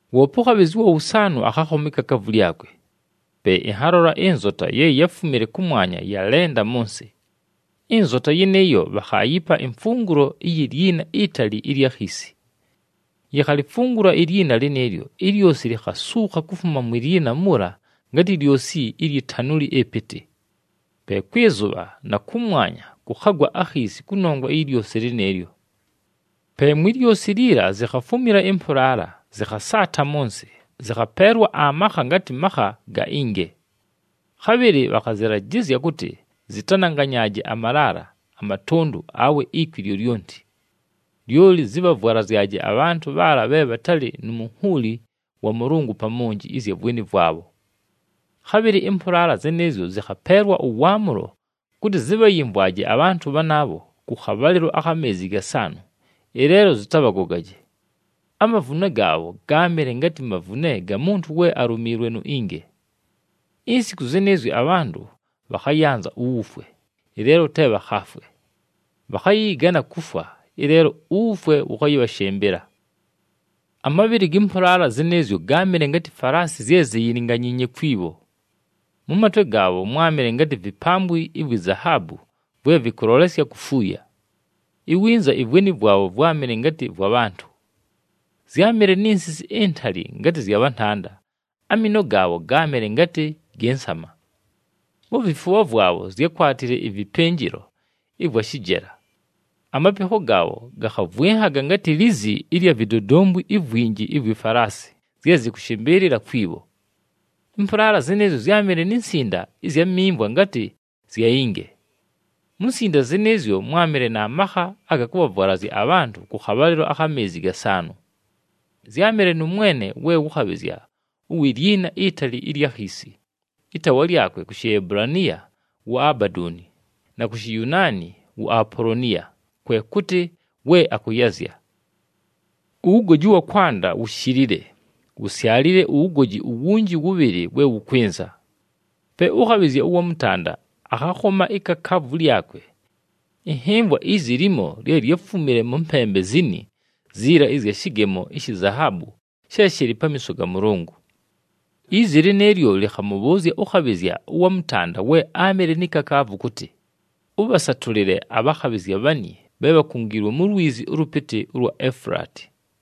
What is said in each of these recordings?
Woope ʉkhabhɨzya ʉwa wʉsaanʉ akhakhoma ikakaavu lyakwe. Pe ɨnhalola ɨnzota ye yáfumile kʉmwanya, yalenda mʉ nsɨ. Ɨnzota yɨnɨɨyo bhakhaayipa imfungulo iyi lyina itali ɨlya khiisi. Yikhalifungula ilyina lɨnɨɨlyo, ilyosi likhasuukha kufuma mwi lyina muula ngatɨ lyosi lyi tanuli ɨpɨtɨ. Pe kwɨ zʉbha na kʉmwanya kʉkhagwa akhiisi kʉnongwa iyi lyosi lɨnɨɨlyo. Pe mwi lyosi liila zikhafumila ɨmpʉlaala, zɨkhasaata mʉ nsɨ, zɨkhapeelwa amakha ngatɨ makha ga inge. Khabhɨlɨ bhakhazɨlajɨzya kʉtɨ zɨtananganyaaje amalaala, amatʉndʉ, awe ikwi lyolyonti. Lyoli zɨbhavwalazyaje abhantʉ bhaala bhe bhatalɨ nu munhuuli wa Mʉlʉngʉ pa monji ɨzya vweni vwabho. Khabhɨlɨ ɨmpʉlaala zɨnɨɨzyo zɨkhapeelwa ʉwaamʉlo kʉtɨ zɨbhayɨmvwaje abhantʉ bhanaabho kʉ khabhalɨlo akha meezi gasaanʉ, ɨleelo zɨtabhagogaje. Amavune gaabho gáamɨle ngatɨ mavune ga muntu we alumiilwe nu inge. Insiku zɨnɨɨzyo abhantʉ bhakhayanza uwufwe, ɨleelo te bhakhaafwe. Bhakhayɨyɨgana kufwa, ɨleelo uwufwe wʉkhayɨbhashɨmbɨla. Amabhɨlɨ gɨ mpʉlaala zɨnɨɨzyo gáamɨle ngatɨ falaasi zye ziyilinganyiinye kwi bho. Mʉ matwe gaabho mwámɨle ngatɨ vipambwi ivwi zahaabu vwe vɨkʉlolesya kufuuya. Iwinza ivweni vwabho vwámɨle ngatɨ vwa bhantʉ. Zyámɨle ni nsisi intali ngatɨ zya bhantanda, amiino gaabho gáamɨle ngatɨ gɨ nsama. Mu vifubha vwabho zyákwatile ɨvɨpɨnjɨlo ɨvwa shɨjela. Amapikho gaabho gakhavwɨnhaga ngatɨ lizi ɨlya vidodombwi ivwinji ivwi falaasi zye zɨkʉshɨmbɨɨlɨla kwi bho. Ɨmpʉlaala zɨnɨɨzyo zyámɨle ni nsinda ɨzya mimvwa ngatɨ zya inge. Mu nsinda zɨnɨɨzyo, mwámɨle na makha aga kʉbhavwalazya abhantʉ kʉ khabhalɨlo akha meezi gasaanʉ. Zyámɨle nʉ mwene we wʉ khabhɨzya uwi lyina itali ɨlya khiisi, ɨtaawa lyakwe ku Shiebulaniya wu Abadooni na ku Shiyunaani wu Apoloniya, kwe kʉtɨ We Akʉyazya. Uwugoji ʉwa kwanda wushilile, wusyalile uwugoji uwunji wʉbhɨlɨ we wʉkwɨnza. Pe ʉkhabhɨzya ʉwa mʉtanda akhakhoma ikakaavu lyakwe. Ɨnhɨmvwa izi limo lye lyáfumile mʉ mpembe zini ziila ɨzya shɨgemo ishi zahaabu she shɨlɨ pamiiso ga Mʉlʉngʉ. Izi lɨnɨɨlyo lɨkhamʉbhʉʉzya ʉkhabhɨzya ʉwa mʉtanda we áamɨle ni kakaavu kʉtɨ, “Ʉbhasatʉlɨle abhakhabhɨzya bhani bhe bhakungiilwe mu lwizi ʉlʉpɨtɨ ʉlwa Efulaati.”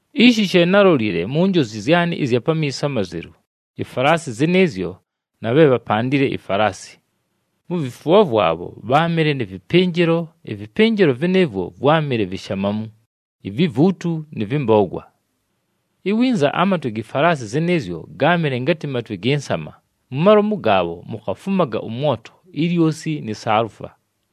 Ishi she nálolile mu njozi zyanɨ ɨzya pamiiso amazelu, ifalaasi zɨnɨɨzyo na bhe bhapandile ifalaasi: mu vifubha vwabho bháamɨle nɨ vɨpɨnjɨlo, ɨvɨpɨnjɨlo vɨnɨɨvwo vwámɨle vishamamu, ivivuutu nɨ vɨmbogwa. Iwinza amatwe gi falaasi zɨnɨɨzyo gáamɨle ngatɨ matwe gɨ nsama, mu malomu gaabho mukhafumaga ʉmwoto, ilyosi ni saalufa.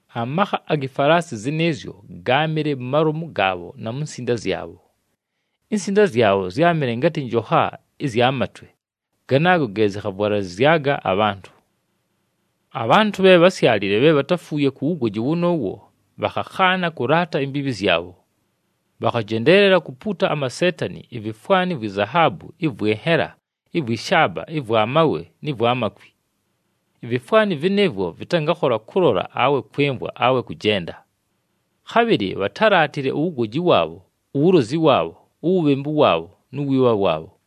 Amakha agi falaasi zɨnɨɨzyo gáamɨle mu malomu gaabho na mu nsinda zyabho. Insinda zyabho zyámɨle ngatɨ njokha ɨzya matwe, ganaago ge zɨkhavwalalɨzyaga abhantʉ. Abhantʉ bhe bhásyalile, bhe bhatáfuuye ku wugoji wʉnʉʉwo, bhakhakhaana kʉlaata imbiibhi zyabho. Bhakhajendeelela kupuuta amaseetani, ivifwani vwi zahaabu, ɨvwɨ nhela, ɨvwɨ shaaba ɨvwa mawe nɨ vwa makwi. Ivifwani vɨnɨɨvwo vɨtangakhola kʉlola awe kwɨmvwa awe kʉjenda. Khabhɨlɨ bhatálaatile uwugoji waabho, uwulozi waabho, uwubhembu waabho nu wiibha waabho.